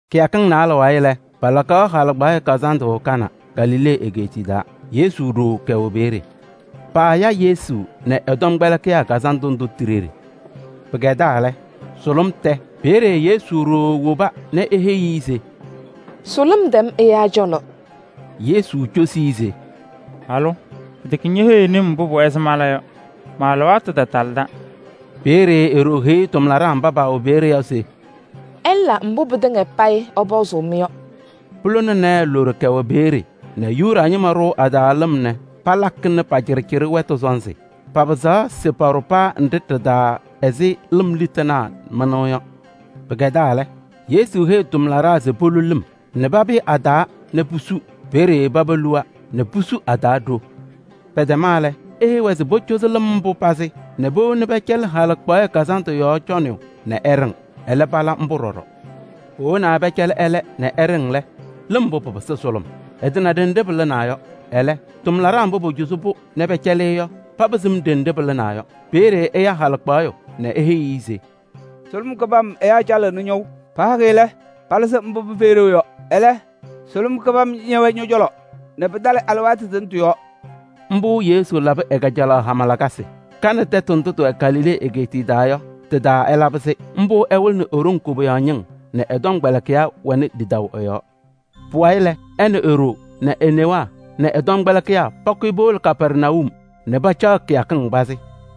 Kɩyakɩŋ naalɛ wayɩ lɛ, palakaɣ halɩkpaɣyɛ kazandʋ Kana, Galilee egeetiye taa. Yesu ɖoo kɛwɛ peeye. Paaya Yesu nɛ ɛ-tɔmkpɛlɩkɩyaa kazandʋ ndʋ ti-ɖeɖe. Pɩkɛdaa lɛ, sʋlʋm tɛ. Peeye Yesu ɖoo woba nɛ eheyi-i se: “Sʋlʋm tɛm ɛyaa cɔlɔ.” Yesu cosi-i se: “Halʋ! Pɩtɛkɛ ñeheyiɣni-m mbʋ pʋwɛɛ se mala yɔ. Ma-alɩwaatʋ tatalɩda.” Peeye e-ɖoo heyi tʋmlaɖaa mba pɛwɛ peeye yɔ se: “Ɩla mbʋ pɩtɩŋa payɩ ɛpɔzʋʋ-mɩ yɔ.” Pulona naayɛ loɖo kɛwɛ peeye nɛ Yuda ñɩma ɖʋʋ a-taa lɩm nɛ palakɩnɩ pa-cɩɖɩcɩɖɩ wɛtʋ sɔnzɩ. Papɩzaɣ se paɖʋ paa nɖɩ ɖɩ-taa ɛzɩ lɩm litanaa mɩnʋʋ yɔ. Pɩkɛdaa lɛ, Yesu heyi tʋmlaɖaa se polu lɩm nɛ papɩyɩ a-taa nɛ pusu. Peeye paba luwa nɛ pusu a-taa ɖo. Pɛtɛma lɛ, eheyi-wɛ se pocozi lɩm mbʋ pazɩ nɛ powoni pɛcɛlɩ halɩkpaɣyɛ kazandʋ yɔɔ cɔnɩyʋ nɛ ɛɖɩŋ. Ɛlɛ pala mbʋ ɖɔɖɔ. Powonaa pɛcɛlɩ ɛlɛ nɛ ɛɖɩŋ lɛ, lɩm mbʋ pɩpɩsɩ sʋlʋm. Ɛtana ɖenɖe pɩlɩnaa yɔ. Ɛlɛ, tʋmlaɖaa mba pocozi-pʋ nɛ pɛcɛlɩ-ɩ yɔ, paba sɩm ɖenɖe pɩlɩnaa yɔ. Peeye ɛya halɩkpaɣyʋ nɛ eheyi-i se: “Sʋlʋm kɩbam ɛyaa calɩɣnɩ ñɔʋ. Pahakɩ lɛ, palɩzɩ mbʋ pɩfɛyɩ ɖeu yɔ. Ɛlɛ, sʋlʋm kɩbam ñɛwɛɛ ñɔ-cɔlɔ nɛ pɩtalɩ alɩwaatʋ tʋnɛ tɩ-yɔɔ!” Mbʋ Yesu labɩ ɛ-kajalaɣ hama lakasɩ. Kana tɛtʋ ndʋ tɩwɛ Galilee egeetiye taa yɔ, tɩ-taa ɛlabɩ-sɩ. Mbʋ ɛwɩlɩnɩ e-ɖoŋ koboyaɣ ñɩŋ nɛ ɛ-tɔmkpɛlɩkɩyaa wɛnɩ lidaʋ ɛ-yɔɔ. Pʋwayɩ lɛ, ɛ nɛ e-ɖoo nɛ e-newaa nɛ ɛ-tɔmkpɛlɩkɩyaa pakʋyɩ powolo Kapɛrnayum nɛ pacaɣ kɩyakɩŋ pazɩ.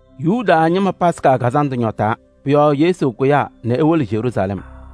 Yuda ñɩma Yomiye Taa Lɩʋ Kazandʋ ñɔtaa. Pʋ-yɔɔ Yesu kʋyaa nɛ ewolo Yeruusalɛm.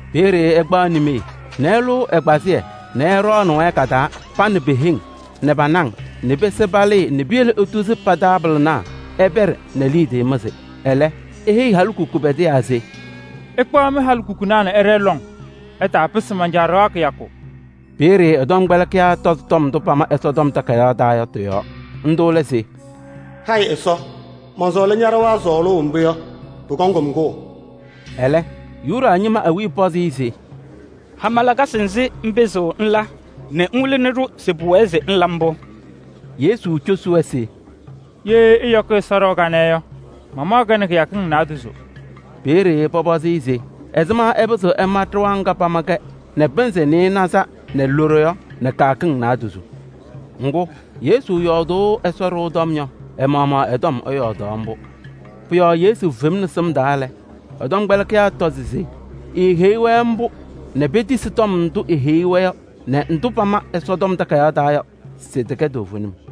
Peeye ɛkpaɣ nimee nɛ ɛlʋʋ ɛgbazɩyɛ nɛ ɛɖɔɔnɩnɩ-wɛ ka-taa, pa nɛ pe-heŋ nɛ pa-naŋ nɛ pese palɩɩ nɛ piyele etuzi pa-taabɩlɩnaa ɛpɛɖɩ nɛ liidiye mɩzɩ. Ɛlɛ, eheyi halikukunaa pɛdɩyaa se: “Ɩkpaɣ mɩ-halikukunaa nɛ ɩɖɛɛ lɔŋ. Ɩtaapɩsɩ man-Caa ɖɩɣa kɩyakʋ.” Peeye ɛ-tɔmkpɛlɩkɩyaa tɔzɩ tɔm ndʋ pama Ɛsɔtɔm Takayaɣ taa yɔ tɩ-yɔɔ. Ndʋ lɛ se: “Hayɩ Ɛsɔ, mɔnsɔɔlɩ ña-ɖɩɣa sɔɔlʋʋ mbʋ yɔ, pʋkɔŋ-m kʋʋ.” Ɛlɛ, Yuda ñɩma awiya pɔzɩ-ɩ se: “Hama lakasɩ nzɩ ŋpɩzɩɣ ŋla nɛ ŋwɩlɩnɩ-ɖʋ se pʋwɛɛ se ŋla mbʋ?” Yesu cosi-wɛ se: “Ye ɩyɔkɩ Ɛsɔ ɖɩɣa kanɛ yɔ, mamaɣ-kɛ nɛ kɩyakɩŋ naadozo.” Peeye pɔpɔzɩ-ɩ se ɛzɩma ɛpɩzɩɣ ɛma ɖɩɣa ŋga pama-kɛ nɛ pɩnzɩ nɩɩnaza nɛ loɖo yɔ nɛ kɩyakɩŋ naadozo? Ŋgʋ, Yesu yɔɔdʋʋ Ɛsɔ ɖɩɣa tɔm yɔ, ɛ-maɣmaɣ ɛ-tɔm ɛyɔɔdaɣ mbʋ. Yesu femni sɩm taa lɛ, ɛ-tɔmkpɛlɩkɩyaa tɔzɩ se eeheyi-wɛ mbʋ nɛ petisi tɔm ndʋ eheyi-wɛ yɔ nɛ ndʋ pama Ɛsɔtɔm Takayaɣ taa yɔ se tɩkɛ toovenim.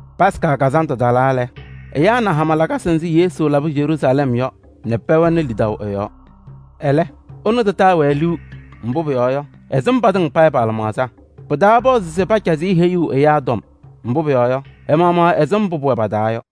Yomiye Taa Lɩʋ Kazandʋ talaa lɛ, ɛyaa na hama lakasɩ nzɩ Yesu labɩ Yeruusalɛm yɔ nɛ pɛwɛnɩ lidaʋ ɛ-yɔɔ. Ɛlɛ, ɛnʋ tataa-wɛ liu, mbʋ pʋyɔɔ yɔ, ɛsɩm patɩŋa payɩ pa-lɩmaɣza. Pɩtaapɔzɩ se pacazɩ-ɩ heyuu ɛyaa tɔm. Mbʋ pʋyɔɔ yɔ, ɛ-maɣmaɣ ɛsɩm mbʋ pʋwɛ pa-taa yɔ.